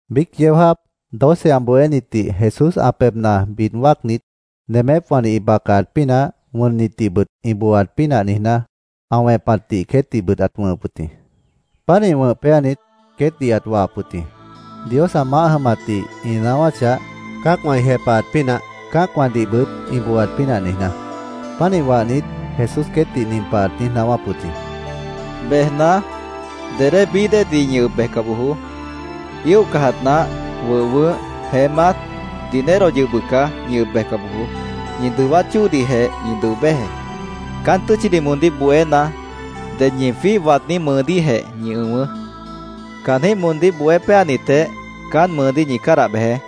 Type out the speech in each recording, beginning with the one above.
Biíc yeó jáap doce ã bohénitdih Jesús ã pebhna bid wáacnit, nemépwãdih ĩ bacaat pínah, wʉnnitdihbʉt ĩ booaat pínah niijná, ã wẽpatdih queétdihbʉt ãt wʉ̃hʉp wʉt jĩ. Pánih wʉ̃h péanit, queétdih ãt wahap wʉt jĩ, Dios ã maáh jʉmatdih ĩ naáwáchah, cã́acwã ĩ jepahat pínah, cã́acwãdihbʉt ĩ booat pínah niijná. Pánih wahnit, Jesús queétdih nin pah ãt niíj naáwáp wʉt jĩ: —Bejna, dedé bií déedih ñi ʉb bejca bojoó. Íoh cajat nah, wʉh wʉʉ́h, jeémát, dinerodih yʉh bʉca ñi ʉb bejca bojoó. Ñi dʉwát chóodihjeh ñi dʉo béjeé. Caán tʉ́tchidih moondíh bohéna, ded ñi jwíih waadní mʉʉdíhjeh ñi ʉ̃wʉʉ́. Caanjĩ́h moondíh bohé péanitjeh caán mʉʉdíh ñi cádah bejeé.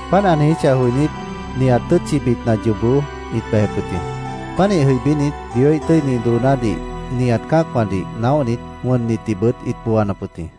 Páant ã niijíchah joinít, nihat tʉ́tchibitna yoobó ĩt bejep wʉt jĩ. Pánih jʉibínit, Dioíh tʉ́ini doonádih nihat cã́acwãdih naóhnit, wʉnnitdihbʉt ĩt booanap wʉt jĩ.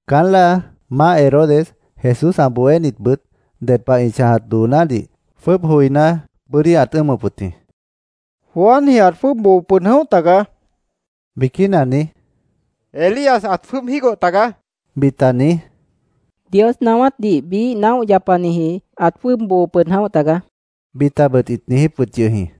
Caán láa Maáh Herodes Jesús ã bohénitbʉt ded pah ĩ chãjat doonádih jwʉ́ʉb joiná, bʉ́dí ãt ʉ́ʉmʉp wʉt jĩ. “Juanji ãt jwʉ́ʉb boo pʉd jʉ̃óh tagaá”, biquína niíj, “Elías ãt jwʉ́ʉb jígoh tagaá”, bita niíj, “Dios naáwátdih biíh naóh yapaniji ãt jwʉ́ʉb boo pʉd jʉ̃óh tagaá”, bitabʉt ĩt niijíp wʉt yʉh jĩ.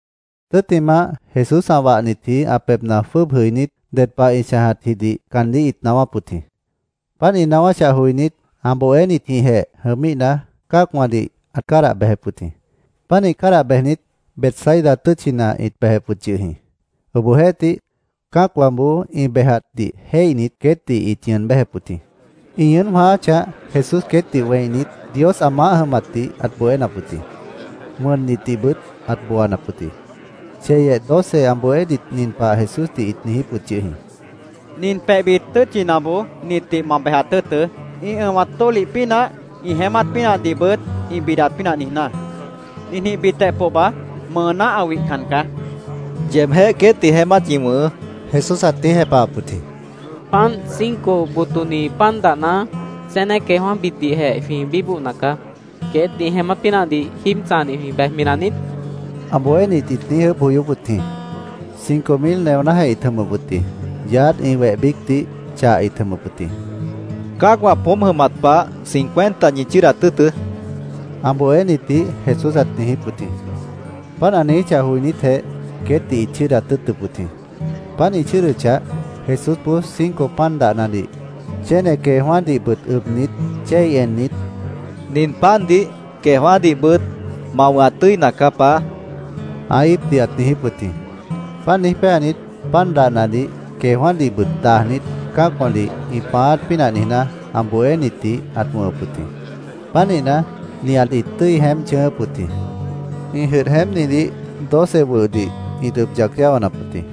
Tʉ́ttimah, Jesús ã wahnitji ã pebhna jwʉ́ʉb jʉibínit, ded pah ĩ chãjatjidih caandíh ĩt naáwáp wʉt jĩ. Páant ĩ naáwáchah joinít, ã bohénitjĩhjeh jʉmíhna, cã́acwãdih ãt cádah bejep wʉt jĩ. Pánih cádah bejnit, Betsaida tʉ́tchina ĩt bejep wʉt yʉh jĩ. Obohjeéhtih, cã́acwãboó ĩ bejatdih jéihnit, queétdih ĩt ñʉʉn béjep wʉt jĩ. Ĩ ñʉʉ́n jwãááchah, Jesús queétdih wẽinit, Dios ã maáh jʉmatdih ãt bohénap wʉt jĩ. Wʉnnitdihbʉt ãt booanap wʉt jĩ. Cheyeh doce ã bohénit nin pah Jesúsdih ĩt niijíp wʉt yʉh jĩ: —Nin pebhbit tʉ́tchinaboó nitdih ma bejat tʉ́ʉtʉ́, ĩ ʉ̃wat tólih pínah, ĩ jeémát pínahdihbʉt ĩ bidat pínah niijná. Ninjĩhbitjeh pohba mʉʉná ã wihcan caá, ĩt niijíp wʉt jĩ. —Yeebjéh queétdih jeémát ñi wʉ̃hʉʉ́, Jesús ãt niíj jepahap wʉt jĩ. —Páant, cinco botoni pan dahna, chéne queejwã́bitdihjeh jwĩ bíbohna caá. ¿Queét ĩ jeémát pínahdih jíib chãjadih jwĩ bejmi naniít? ã bohénit ĩt niíj ʉʉ́bh joyóp wʉt jĩ. (Cinco mil neonájeh ĩt jʉmʉp wʉt jĩ. Yaádh ĩ weh biícdih chah ĩt jʉmʉp wʉt jĩ.) —Cã́acwã poómp jʉmat pah cincuenta ñi chʉ́ʉdat tʉ́ʉtʉ́, ã bohénitdih Jesús ãt niijíp wʉt jĩ. Páant ã niijíchah joinítjeh, queétdih ĩt chʉ́ʉdat tʉ́ʉtʉp wʉt jĩ. Páant ĩ chʉ́ʉdʉchah, Jesúsboó cinco pan dahnadih, chéne queejwã́dihbʉt ʉbnit, chéi ennit, —Nin pandih, queejwã́dihbʉt ma wʉ̃hat tʉ́ina caá, Paá, ã íipdih ãt niijíp wʉt jĩ. Páant niíj péanit, pan dahnadih queejwã́dihbʉt dajnit, cã́acwãdih ĩ pãáát pínah niijná, ã bohénitdih ãt wʉ̃hʉp wʉt jĩ. Pánihna, nihat ĩt tʉ́i jeémp chʉ̃ʉ́ʉ́p wʉt jĩ. Ĩ jʉdh jeémpnidih doce wʉhdih ĩt ʉb yac yáwanap wʉt jĩ.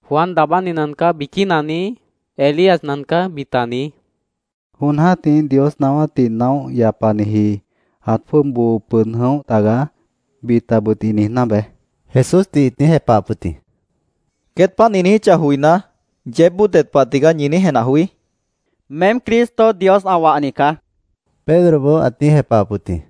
—‘Juan Daabáni nacaá’, biquína niíj, ‘Elías nacaá’, bita niíj, ‘Jon jã́tih Dios naáwátdih naóh yapaniji ãt jwʉ́ʉb boo pʉd jʉ̃óh tagaá’, bitabʉt ĩ niijná beé, Jesúsdih ĩt niíj jepahap wʉt jĩ. —Queét páant ĩ niijíchah joiná, ¿yeébboó ded pah tigaá ñi niíj jenah joí? queétdih ãt niijíp wʉt jĩ. —Meém Cristo, Dios ã wahni caá, Pedroboó ãt niíj jepahap wʉt jĩ.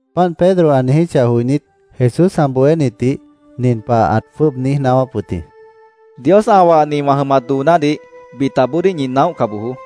Páant Pedro ã niijíchah joinít, Jesús ã bohénitdih nin pah ãt jwʉ́ʉb niíj naáwáp wʉt jĩ: —Dios ã wahni wã jʉmat doonádih bitaboodíh ñi naóhca bojoó.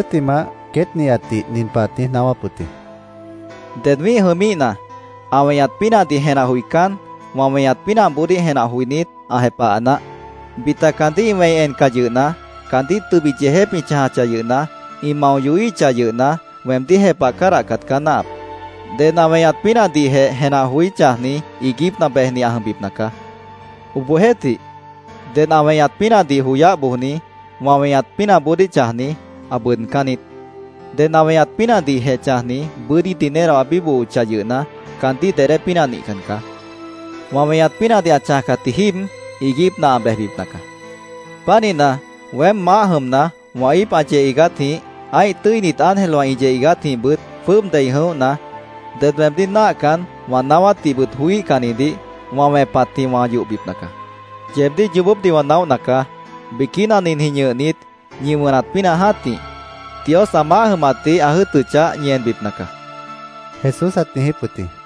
Tʉ́ttimah, queét nihatdih nin pah ãt niíj naáwáp wʉt jĩ: —Ded wĩ́ih jʉmíhna, ã weñat pínahdih jenah joicán, wã weñat pínahboodíh jenah joinít, ã jepaha naáh. Bita caandíh ĩ wẽi encah yʉhna, caandíh tʉbit yeejép ĩ chãjachah yʉhna, ĩ mao yohíhichah yʉhna, weemdíh jepah cádahcat caá náahap. Ded ã weñat pínahdihjeh jenah joí chãjni iiguípna bejni ã jʉmbipna caá. Obohjeéhtih, ded ã weñat pínahdih joyáh bojni, wã weñat pínahboodíh chãjni, ã bʉʉdcán niít. Ded ã weñat pínahdihjeh chãjni, bʉ́dí dinero ã bíbohochah yʉhna, caandíh dedé pínah nihcan caá. Wã weñat pínahdih ã chãjcatji jíib, iiguípna ã bejbipna caá. Pánihna, weém maáh jʉmna, wã íip ã yeh iigátjĩh, ã́ih tʉ́init ángelwã ĩ yeh iigátjĩhbʉt jwʉ́ʉb dei jʉ̃óhna, ded weemdíh náahcan, wã naáwátdihbʉt joííhcannidih wã wẽpatjĩh wã yohbipna caá. Yeebdíh yoobópdih wã naóhna caá. Biquína ninjĩh ñʉhnit ñi wʉnat pínah jã́tih, Dios ã maáh jʉmatdih ã jʉ́ʉtʉchah, ñi enbipna caá, Jesús ãt niijíp wʉt jĩ.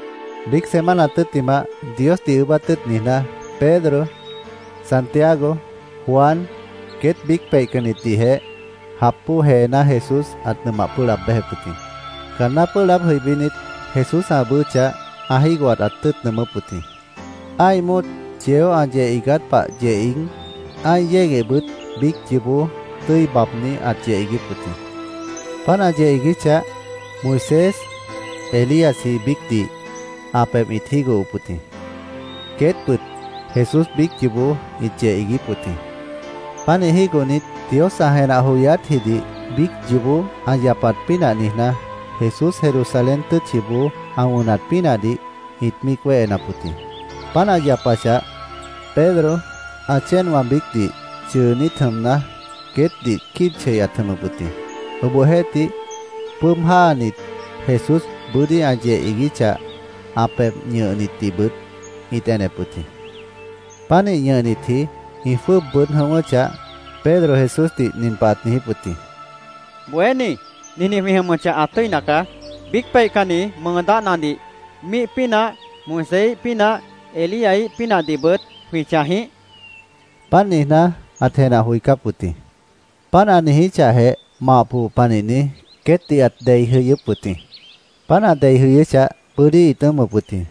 Biíc semana tʉ́ttimah, Diosdih ʉʉ́bát tʉ́ʉt niijná, Pedro, Santiago, Juan queét biíc peihcannitdihjeh jap bóo jeená Jesús ãt nʉmah pʉ́ʉh laab béjep wʉt jĩ. Caanná ĩ pʉ́ʉh laáb jʉibínit, Jesús ã ʉʉ́bʉ́chah, ã jígohat ãt tʉ́ʉt nʉʉmʉ́p wʉt jĩ. Ã́ih móot yeó ã yeh iigát pah yeh iíg, ã́ih yéguehbʉt biíc yoobó tʉ́i baabní ãt yeh iiguíp wʉt jĩ. Páant ã yeh iiguíchah, Moisés, Elíasji biícdih ã pebh ĩt jígohop wʉt jĩ. Queétbʉt Jesús biíc yoobó ĩt yeh iiguíp wʉt jĩ. Pánih jígohnit, Dios ã jenah joyátjidih biíc yoobó ã yapat pínah niijná, Jesús Jerusalén tʉ́tchiboó ã wʉnat pínahdih ĩt míic wéhenap wʉt jĩ. Páant ã yapachah, Pedro ã chéenwã biícdih chʉʉnít jʉmna, queétdih quíib chei ãt jʉmʉp wʉt jĩ. Obohjeéhtih, jwʉ́ʉb jáanit, Jesús bʉ́dí ã yeh iiguíchah, ã pebh ñʉhnitdihbʉt ĩt enep wʉt jĩ. Pánih ñʉhnitji ĩ jwʉ́ʉb bʉʉ́d jʉ̃ʉ́wʉ́chah, Pedro Jesúsdih nin pah ãt niijíp wʉt jĩ: —¡Bohéní, ninjĩh jwĩ jʉmʉchah, ã tʉ́ina caá! ¿Biíc peihcanni mʉʉ dáhnadih, míih pínah, Moiséíh pínah, Elíaíh pínahdihbʉt jwĩ chãj jĩíh? ãt niijíp wʉt yʉh jĩ. Páant niijná, ãt jenah joicáp wʉt jĩ. Páant ã niijíchahjeh, mah põh panihni queétdih ãt dei jʉyʉ́p wʉt jĩ. Páant ã dei jʉyʉ́chah, bʉ́dí ĩt ʉ́ʉmʉp wʉt jĩ.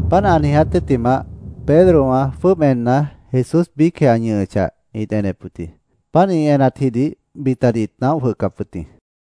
Páant ã niiját tʉ́ttimah, Pedrowã jwʉ́ʉb enna, Jesús biícjeh ã ñʉhʉchah, ĩt enep wʉt jĩ. Páant ĩ enatjidih bitadih ĩt naóh jwʉhcap wʉt jĩ.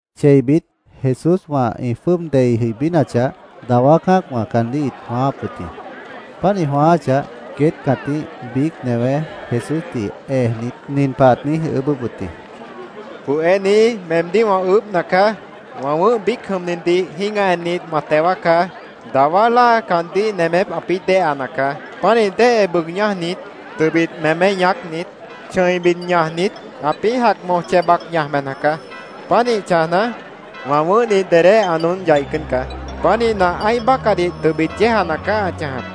Cheibit Jesúswã ĩ jwʉ́ʉb dei jʉibínachah, dawá cã́acwã caandíh ĩt jwãááp wʉt jĩ. Páant ĩ jwãááchah, queét cãtíh biíc newé Jesúsdih ejnit, nin pah ãt niíj ʉʉ́bʉ́p wʉt jĩ: —Bohéní, meemdíh wã ʉʉ́bhna caá. Wã wʉ̃ʉ́h biíc jʉmnidih jĩ́gah ennit, ma teo wáacá. Dawá láa nemép caandíh ãpĩ́ déheana caá. Pánih déhe bʉʉg ñájnit, tʉbit mémé ñaácnit, chʉ̃i bid ñajnit, ãpĩ́ jac moj chej bac ñaj bejna caá. Pánih chãjna, wã wʉ̃ʉ́hdih dedé ã noón yaicán caá. Pánihna, ã́ih bácahdih tʉbit yéejana caá ã chãjap.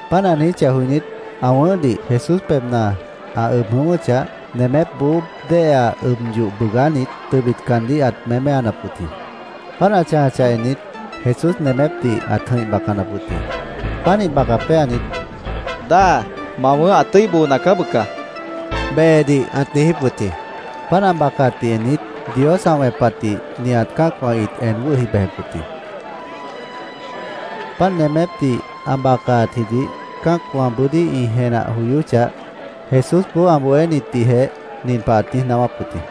Páant ã niijíchah joinít, ã wʉ̃ʉ́hdih Jesús pebhna ã ʉb jʉ̃ʉ́wʉ́chah, nemépboó déhea ʉb yoh bʉʉgánit, tʉbit caandíh ãt méméanap wʉt jĩ. Páant ã chãjachah ennit, Jesús nemépdih ãt jʉ̃ih bacanap wʉt jĩ. Pánih baca péanit, —Dáa, ma wʉ̃ʉ́h ã tʉ́i boona caá bʉca, behedih ãt niijíp wʉt jĩ. Páant ã bacaatdih ennit, Dios ã wẽpatdih nihat cã́acwã ĩt en wʉ́hi bejep wʉt jĩ. Páant nemépdih ã bacaatjidih cã́acwã bʉ́dí ĩ jenah joyóchah, Jesúsboó ã bohénitdihjeh nin pah ãt niíj naáwáp wʉt jĩ: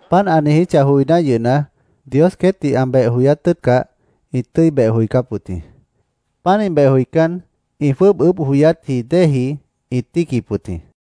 Páant ã niijíchah joiná yʉhna, Dios queétdih ã beh joyát tʉ́ʉtcah, ĩt tʉ́i beh joicáp wʉt jĩ. Pánih beh joicán, ĩ jwʉ́ʉb ʉʉ́bh joyátji déeji ĩt tíiquip wʉt jĩ.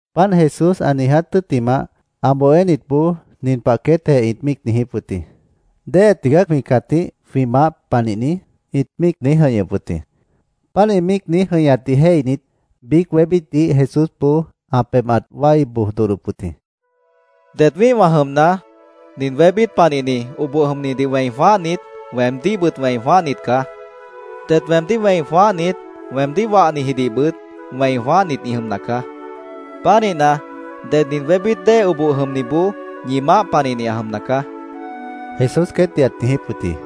Páant Jesús ã niiját tʉ́ttimah, ã bohénitboó nin pah queétjeh ĩt míic niijíp wʉt jĩ: “¿Déhe tigaá jwĩ cãtíh jwĩ maáh panihni?” ĩt míic niíj jʉ̃ihñʉp wʉt jĩ. Páant ĩ míic niíj jʉ̃ihñatdih jéihnit, biíc wébítdih Jesúsboó ã pebh ãt wái boj dodhdop wʉt jĩ. —Det wĩ́ihwã jʉmna, nin wébít panihni, oboh jʉmnidih wẽi jwãáhnit, weemdíhbʉt wẽi jwãáhnit caá. Det weemdíh wẽi jwãáhnit, weemdíh wahnijidihbʉt wẽi jwãáhnit ĩ jʉmna caá. Pánihna, ded nin wébít dée oboh jʉmniboó ñi maáh panihni ã jʉmna caá, Jesús queétdih ãt niijíp wʉt jĩ.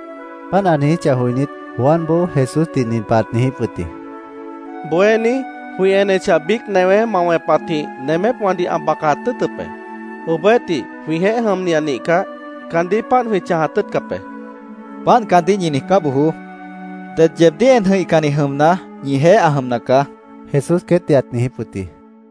Páant ã niijíchah joinít, Juanboó Jesúsdih nin pah ãt niijíp wʉt jĩ: —Bohéní, jwĩ enechah, biíc newé ma wẽpatjĩh nemépwãdih ã bacat tʉ́ʉtʉp be. Obohjeéhtih, jwĩjeéh jʉmni ã nihcah, caandíh páant jwĩ chãjat tʉ́ʉtcap be, ãt niijíp wʉt jĩ. —Páant caandíh ñi niijcá bojoó. Ded yeebdíh en jʉ̃ihcanni jʉmna, ñijeéh ã jʉmna caá, Jesús queétdih ãt niijíp wʉt jĩ.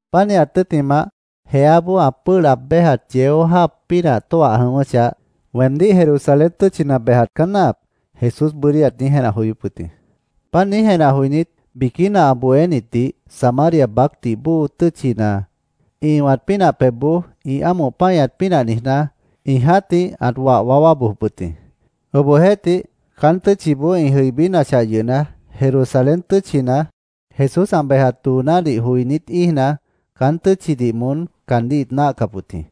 Pánihat tʉ́ttimah, jeáboó ã pʉ́ʉh laab béjat yeó jáap pínah tóah jʉ̃ʉ́wʉ́chah, “Weemdíh Jerusalén tʉ́tchina bejat caá náahap”, Jesús bʉ́dí ãt niíj jenah joyóp wʉt jĩ. Páant niíj jenah joinít, biquína ã bohénitdih Samaria baácdih bóo tʉ́tchina ĩ ʉ̃wat pínah pebhboó ĩ ámoh páñat pínah niijná, ĩ jã́tih ãt wah waáwá bojop wʉt jĩ. Obohjeéhtih, caán tʉ́tchiboó ĩ jʉibínachah yʉhna, Jerusalén tʉ́tchina Jesús ã bejat doonádih joinít íijna, caán tʉ́tchidih moón caandíh ĩt náahcap wʉt jĩ.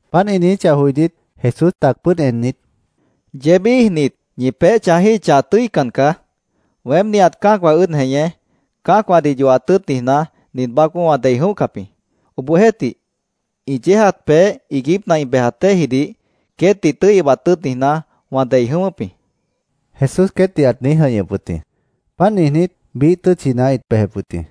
Páant ĩ niijíchah joinít, Jesús tac pʉ́ʉd ennit, —Yeéb íijnit, ñi peéh chãjíhichah, ã tʉ́ican caá. Weém, nihat cã́acwã ʉ́ʉd jeñé cã́acwãdih yohat tʉ́ʉt niijná, nin baácboó wã dei jʉ̃óhcap jĩ. Obohjeéhtih ĩ yéejat peéh iiguípna ĩ bejat déejidih queétdih tʉ́i ʉbat tʉ́ʉt niijná, wã dei jʉ̃ʉ́wʉ́p jĩ, Jesús queétdih ãt niíj jʉ̃ihñʉp wʉt jĩ. Páant niijnít, biíh tʉ́tchina ĩt bejep wʉt jĩ.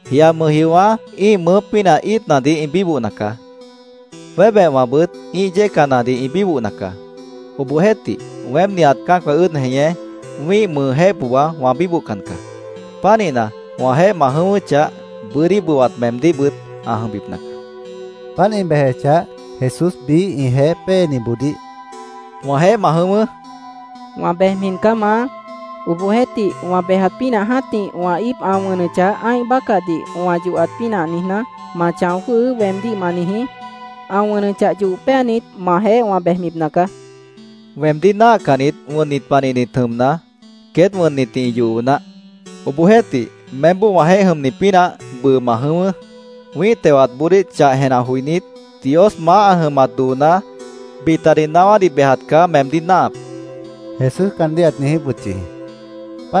—Jia mʉjjiowã́ ĩ́ih mʉʉ́ pínah íitnadih ĩ bíbohna caá. Jwébehwãbʉt ĩ́ih yécanadih ĩ bíbohna caá. Obohjeéhtih, weém nihat cã́acwã ʉ́ʉd jeñé wĩ́ih mʉʉjéh pohba wã bíbohcan caá. Pánihna, wãjeéh ma jʉ̃ʉ́wʉ́chah, bʉ́dí bʉwat meemdíhbʉt ã jʉmbipna caá, Jesús caandíh ãt niijíp wʉt jĩ. Páant ĩ bejechah, Jesús biíh ĩjeéh péeniboodíh —Wãjeéh ma jʉ̃ʉ́wʉ́, ãt niijíp wʉt jĩ. —Wã bejmi caá, Maá. Obohjeéhtih, wã bejat pínah jã́tih wã íip ã wʉnʉchah, ã́ih bácahdih wã yohat pínah niijná, ‘Ma chão jwʉ́hʉʉ́’, weemdíh ma niijí. Ã wʉnʉchah, yoh péanit, majeéh wã péebipna caá, ãt niijíp wʉt jĩ. —Weemdíh náahcannit wʉnnit panihnit jʉmna, queét wʉnnitdih ĩ yoho naáh. Obohjeéhtih, meémboó wãjeéh jʉmni pínah bʉʉ ma jʉ̃ʉ́wʉ́. Wĩ́ih tewatboodíh chah jenah joinít, Dios maáh ã jʉmat dooná, bitadih naáwádih bejat caá meemdíh náahap, Jesús caandíh ãt niijíp wʉt yʉh jĩ.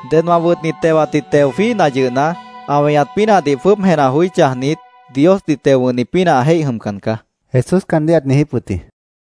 —Ded wã wʉtni tewatdih teo jwíihna yʉhna, ã weñat pínahdih jwʉ́ʉb jenah joí chãjnit, Diosdih teo wʉ̃hni pínah ã jéih jʉmcan caá, Jesús caandíh ãt niijíp wʉt jĩ.